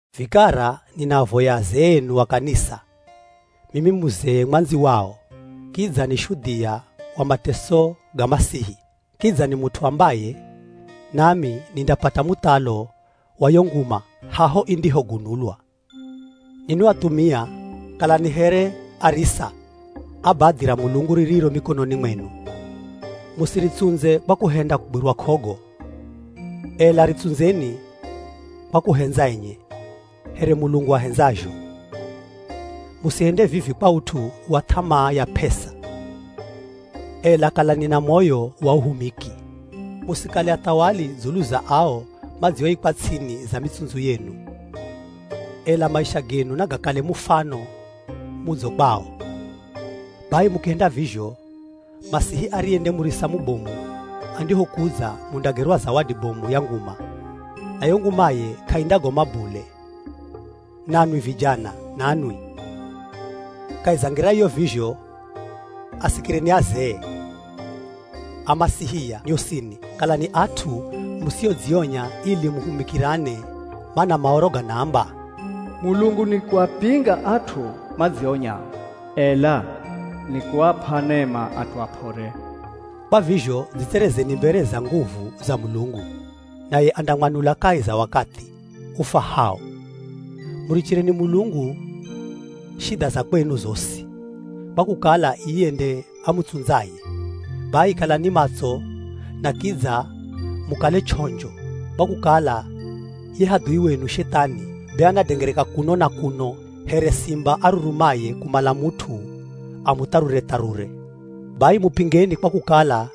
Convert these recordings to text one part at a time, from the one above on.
Vikara ninaavoya azee enu a kanisa, mimi muzee mwandzi wao, kidza ni shudhia wa mateso ga Masihi, kidza ni mut'u ambaye nami nindapata muthalo wa yo nguma haho indihogunulwa. Ninwi athumia kalani here arisa a badhi ra Mulungu ririro mikononi mwenu, Musiritsundze kwa kuhenda kugwirwa k'ogo, ela ritsundzeni kwa kuhendza enye, here Mulungu ahendzazho. Musihende vivi kwa ut'u wa th'amaa ya p'esa, ela kalani na moyo wa uhumiki. Musikale athawali dzulu za ao madzioikwa ts'ini za mitsundzu yenu, ela maisha genu nagakale mufano mudzo kwao. Bai mukihenda vizho, Masihi ariye nde murisa mubomu andihokudza mundagerwa zawadi bomu ya nguma, na yo ngumaye k'aindagoma bule. Nanwi vijana nanwi, kahi za ngira iyo vizho, asikireni azee. Amasihia nyosini kalani at'u musiodzionya, ili muhumikirane, mana Maoro ganaamba, “Mulungu nikuapinga at'u madzionyao, ela nikuap'a nema at'u ap'ore.” Kwa vizho dzitserezeni mbere za nguvu za Mulungu, naye andamwanula kahi za wakathi ufwahao. Murichireni Mulungu shidha za kwenu zosi kwa kukala iye nde amutsundzaye. Bai kalani matso na kidza mukale ch'onjo, kwa kukala ye hadhui wenu Shethani be anadengereka kuno na kuno here simba arurumaye kumala mut'u amutharure-tharure. Bai mupingeni kwa kukala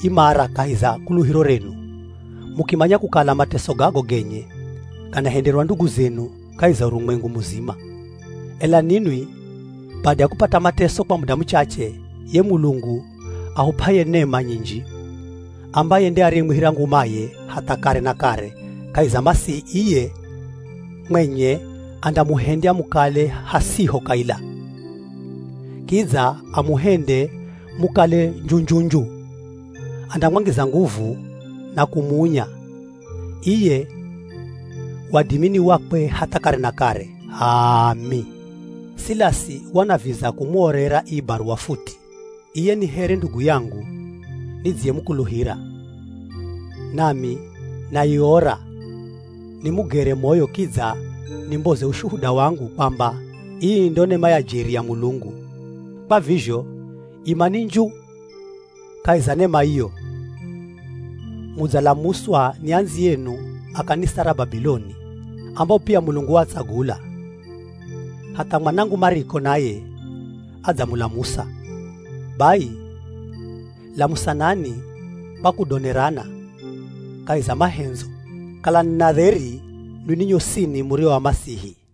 imara kahi za kuluhiro renu, mukimanya kukala mateso gago genye ganahenderwa ndugu zenu kahi za urumwengu muzima. Ela ninwi bada ya kupata mateso kwa muda muchache, ye Mulungu ahup'aye nema nyinji, ambaye nde ariyemwihira ngumaye hatha kare na kare kahi za Masihi, iye mwenye andamuhendya mukale hasiho kaila, kidza amuhende mukale nju-nju-nju, andamwangiza nguvu na kumuunya. Iye, wadimi ni wakwe hatha kare na kare! H'aami. Silasi wanaviza kumuorera ii baruwa futi, iye ni here ndugu yangu nidziyemukuluhira. Nami naiora nimugere moyo kidza nimboze ushuhuda wangu kwamba ii ndo nema ya jeri ya Mulungu. Kwa vizho, imani nju kahi za nema iyo. Mudzalamuswa ni andziyenu a kanisa ra Babiloni ambao pia Mulungu waatsagula, hatha mwanangu Mariko naye adzamulamusa. Bai lamusanani kwa kudonerana kahi za mahendzo. Kalani na dheri ninwi nyosini murio a Masihi.